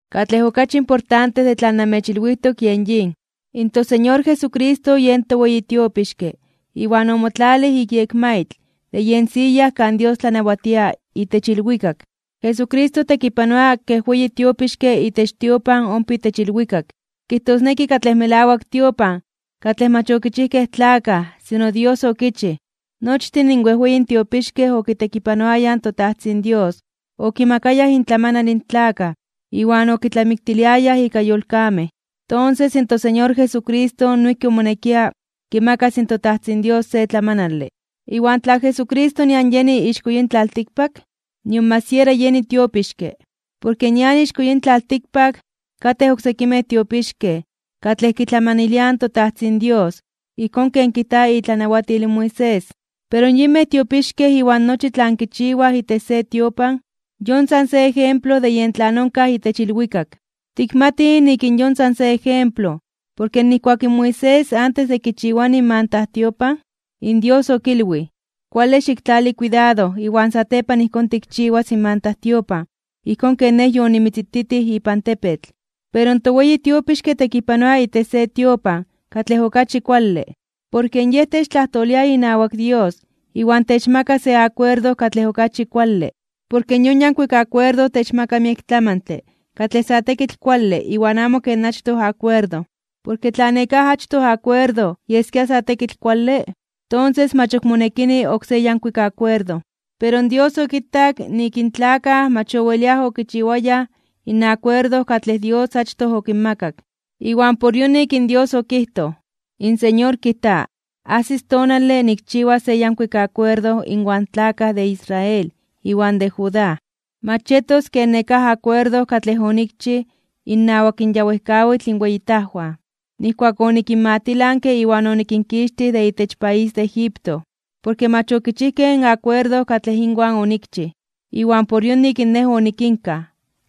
Katlej okachi importante de tlan namechilwijtok, kijtosneki in toSeñor Jesucristo yen toweyi tiopixke iwan omotlalij ik yekmaitl de yen siya kan Dios tlanawatia itech ilwikak. Jesucristo tekipanoa kej weyi tiopixke itech tiopan ompa itech ilwikak, kijtosneki katlej melawak tiopan katlej mach okichijkej tlakaj sino Dios okichij. Nochtin in wejweyin tiopixkej okitekipanoayaj in toTajtzin Dios okimakayaj intlamanal in tlakaj iwan okitlamiktiliayaj ika yolkamej, tonses in toSeñor Jesucristo noijki omonekia kimakas in toTajtzin Dios se tlamanale. Iwan tla Jesucristo nian yeni ixko yin tlaltikpak, nion mach siera yeni tiopixke, porke nian ixko yin tlaltikpak katej oksekimej tiopixkej katlej kitlamaniliaj in toTajtzin Dios ijkón ken kijta itlanawatil in Moisés. Pero yinmej tiopixkej iwan nochi tlan kichiwaj itech se tiopan, yon san se ejemplo de yen tlan onkaj itech ilwikak. Tikmatij nik in yon san se ejemplo porke nijkuak in Moisés antes de kichiwani in mantajtiopan, in Dios okilwij: “Kuale xiktlali kuidado iwan satepan ijkón tikchiwas in mantajtiopan ijkón ken Nej yonimitzititij ipan tepetl.” Pero toweyi tiopixke tekipanoa itech se tiopan katlej okachi kuale. Porke Yej techtlajtolia inawak Dios iwan techmaka se akuerdo katlej okachi kuale, porke yon yankuik akuerdo techmaka miek tlamantle katlej sa tekitl kuale iwan amo ken achtoj akuerdo. Porke tla nekáj achtoj akuerdo yeskia sa tekitl kuale, tonses mach ok monekini oksé yankuik akuerdo. Pero Dios okitak nik in tlakaj mach oweliaj okichiwayaj in akuerdo katlej Dios achtoj okinmakak, iwan por yonik in Dios okijtoj: In Señor kijta: Ajsis tonale nikchiwas se yankuik akuerdo inwan tlakaj de Israel iwan de Judá. Mach yetos ken nekáj akuerdo katlej onikchij innawak in ya wejkawitl inweyitajwan, nijkuak onikinmatilanke iwan onikinkixtij de itech país de Egipto. Porke mach okichijkej in akuerdo katlej inwan onikchij, iwan por yonik Nej onikinkaj,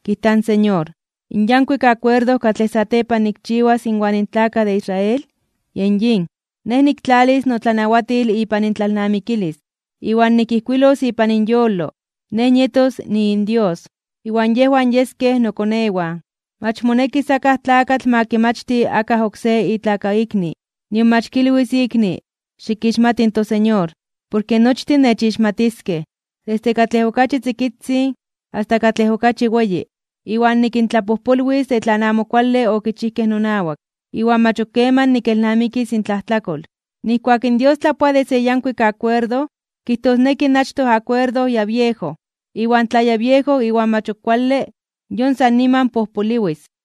kijta in Señor. In yankuik akuerdo katlej satepan nikchiwas inwan tlakaj de Israel, yen yin: Nej niktlalis notlanawatil ipan intlalnamikilis, iwan nikijkuilos ipan inyolo. Nej nietos niinDios, iwan yejwan yeskej nokonewan. Mach monekis akaj tlakatl ma kimachti akaj oksé itlakaikni, nion mach kilwis ikni ma kixmati in Señor. Porke nochtin nechixmatiskej, desde katlej okachi tzikitzin asta katlej okachi weyi. Iwan nikintlapojpolwis de tlan amo kuale okichijkej nonawak, iwan mach ok keman nikelnamikis intlajtlakol. Nijkuak in Dios tlapoa de se yankuik akuerdo, kijtosneki in achtoj akuerdo ya biejo. Iwan tlan ya biejo iwan mach ok kuale, yon san niman pojpoliwis.